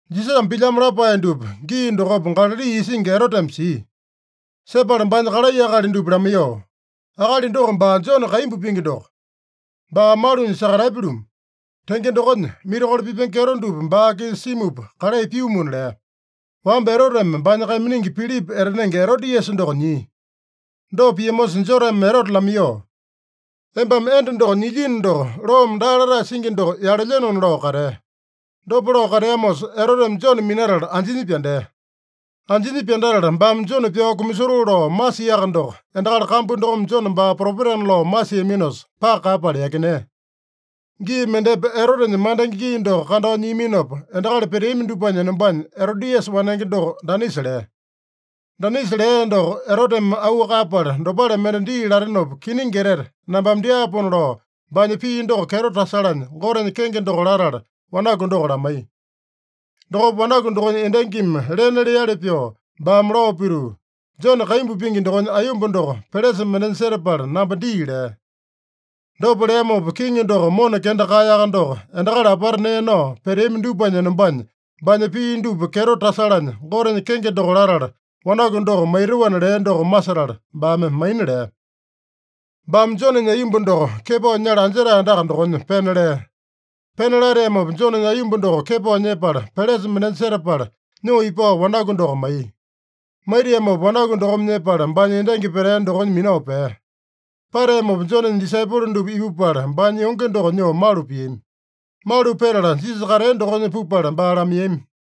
Jisasame pilyamo lapae dupa gii dokopa Galali isingi Eroteme sia. Sepala baanya kalai akali dupa lamaiyoo, “Akali doko baa Jone kaimbu pingi doko. Baa malunya sakatapya-lumu. Tenge dokonya, mirakolo pipenge kyeto dupa baa-kisa simupa kalai pyumuna” lea. Wamba Eroteme baanya kaiminingi Pilipa etanenge Erodiasa doko nyia. Dopa piamosa Joneme Erote lamaiyoo, “Embame enda doko nyilyino doko, loome daa latae singi doko yalelyenona” lao katea. Dopa lao kateamosa, Eroteme Jone minatala anjinya pyandea. Anjinya pyandatala baame Jone pyao kumasotoo lao masiaka doko, endakali kambu dokome Jone baa propetana lao masiaminosa, paka kaeyapala yakinea. Gii mendepa Erotenya mandenge gii doko kandao nyiaminopa, endakali peteami dupanya enombanya Erodiasa wanenge doko danisa lea. Danisa lea doko Eroteme auu kaeyapala, dopale mende dii latenopa, kiningi etete nambame dyaapona lao, baanya pii doko kyeto tasalanya, Gotenya kenge doko latala wanaku doko lamaiya. Dokopa wanaku dokonya endangimi lena leali pyoo, baame lao pituu, “Jone kaimbu pingi dokonya aiyomba doko pelesa mendenya setapala namba dii” lea. Dopa leamopa kiŋi doko mona kenda kaeyaka doko, endakali apata nee nao peteami dupanya enombanya, baanya pii dupa kyeto tasalanya Gotenya kenge doko latala, wanaku doko maitoana lea doko masetala, baame maina lea. Baame Jonenya aiyomba doko kepao nyala anjetae andaka dokonya pena lea. Pena lateamopa, Jonenya aiyomba doko kepao nyepala, pelesa mendenya setapala, nyoo ipao wanaku doko maiya. Maitiamopa wanaku dokome nyepala, baanya endangi petea dokonya minao pea. Pateamopa Jonenya disaipolo dupa ipupala, baanya yonge doko nyoo malu piami. Malu petala, Jisasa katea dokonya pupala baa lamaiyami.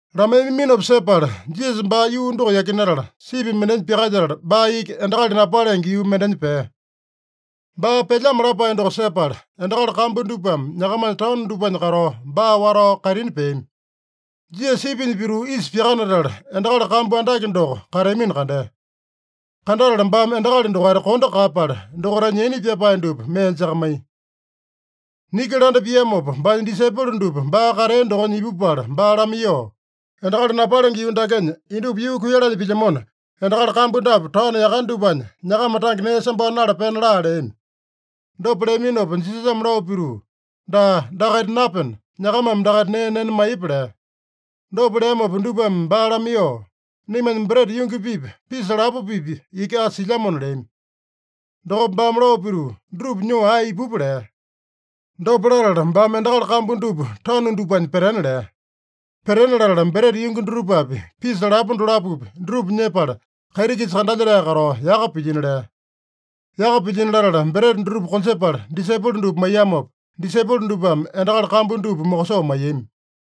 Lamaiyaminopa sepala, Jisasa baa yuu doko yakinatala, sipi mendenya pyakalyetala, baa iki endakali napalenge yuu mendenya pea. Baa pelyamo lapae doko sepala, endakali kambu dupame nyakamanya taono dupanya katao, baa watao kaitini peami. Jisasa sipinya pituu isa pyakanatala, endakali kambu andake doko kateamino kandea. Kandatala baame endakali dokaita kondo kaeyapala, dokaitanya yaina pyapae dupa mee jakamaiya. Niki landa piamopa, baanya disaipolo dupa baa katea dokonya ipupala baa lamaiyoo, “Endakali napalenge yuu dakenya indupa yuu kuiyalanya pilyamona, endakali kambu dapu taono yakane dupanya nyakama tange nee sambao nala pena laa” leami. Dopa leaminopa Jisasame lao pituu, “Daa, dakaita napena, nyakamame dakaita nee nena maiyepa” lea. Dopa leamopa dupame baa lamaiyoo, “Naimanya breta yungi-pipa, pisa lapo-pipa iki asa silyamona” leami. Dokopa baame lao pituu, “Dutupa nyoo ae ipupa” lea. Dopa latala baame endakali kambu dupa tanu dupanya petena lea. Petena latala, breta yungi dutupapi, pisa lapo dolapopi, dutupa nyepala, kaiti-kisa kandalyetae katao yaka pilyino lea. Yaka pilyino latala, breta dutupa konjepala disaipolo dupa maiyamopa, disaipolo dupame endakali kambu dupa mokosoo maiyami.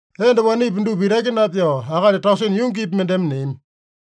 Enda wanepi dupa itaki napyao, akali tausene yungipi mendeme neami.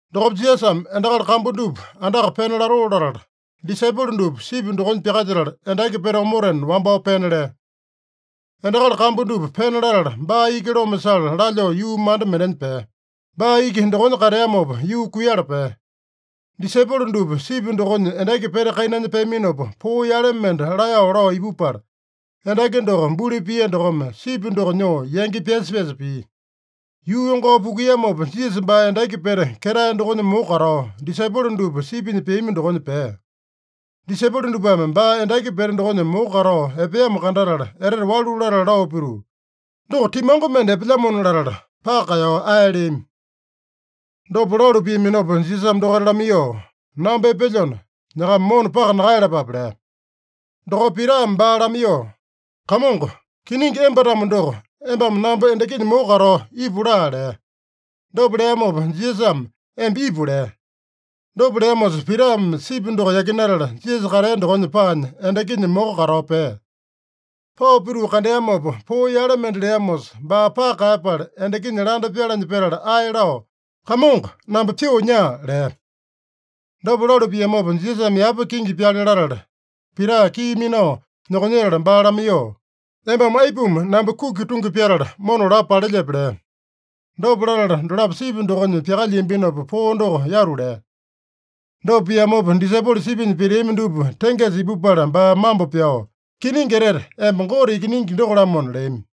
Dokopa Jisasame endakali kambu dupa andaka pena latoo latala, disaipolo dupa sipi dokonya pyakalyetala, endaki pete omotena wambao pena lea. Endakali kambu dupa pena latala, baa iki loma sala lalyoo yuu manda mendenya pea. Baa iki dokonya kateamopa, yuu kuiyala pea. Disaipolo dupa sipi dokonya endaki pete kainanya peaminopa, poo yale mende laeyao lao ipupala, endaki doko buli pia dokome, sipi doko nyoo yangi pyasa-pyasa pia. Yuu yongao pukuiyamopa, Jisasa baa endaki pete ketae dokonya moko katao, disaipolo dupa sipinya peami dokonya pea. Disaipolo dupame baa endaki pete dokonya moko katao epeamo kandatala, etete walu latala lao pituu, “Doko timango mende epelyamona” latala, paka kaeyao ae leami. Dopa lalu piaminopa Jisasame dokaita lamaiyoo, “Namba epelyona, nyakama mona paka nakaeyalapape” lea. Dokopa Pitame baa lamaiyoo, “Kamongo, kiningi emba-tamo doko, embame namba endakinya moko katao ipu laa” lea. Dopa leamopa Jisasame, “Emba ipu” lea. Dopa leamosa, Pitame sipi doko yakinatala, Jisasa katea dokonya paanya, endakinya moko katao pea. Pao pituu kandeamopa, poo yale mende leamosa, baa paka kaeyapala, endakinya landa pyalanya petala, ae lao, “Kamongo, namba pyoo nyaa!” lea. Dopa lalu piamopa, Jisasame yapa kingi pyale latala, Pita kii minao nyokonyetala baa lamaiyoo, “Embame aipuma namba kuki tungi pyatala, mona lapo palelyepe?” lea. Dopa latala dolapo sipi dokonya pyakalyiambinopa, poo doko yatu lea. Dopa piamopa, disaipolo sipinya peteami dupa tengesa ipupala baa mambo pyao, “Kiningi etete, emba Gote Ikiningi doko-lamona” leami.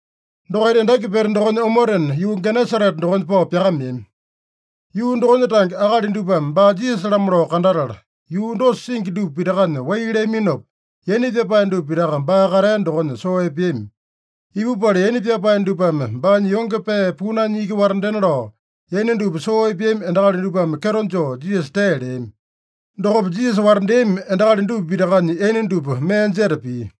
Dokaita endaki pete dokonya omotena, yuu Genesarete dokonya pao pyakameami. Yuu dokonya tange akali dupame baa Jisasa-lamo lao kandatala, yuu dosa singi dupa pitakanya wai leaminopa, yaina pyapae dupa pitaka baa katea dokonya soo epeami. Ipupala, yaina pyapae dupame baanya yonge pee punanya iki watandena lao, yaina dupa soo epeami endakali dupame kyeto joo Jisasa tee leami. Dokopa Jisasa watandeami endakali dupa pitakanya yaina dupa mee jeta pia.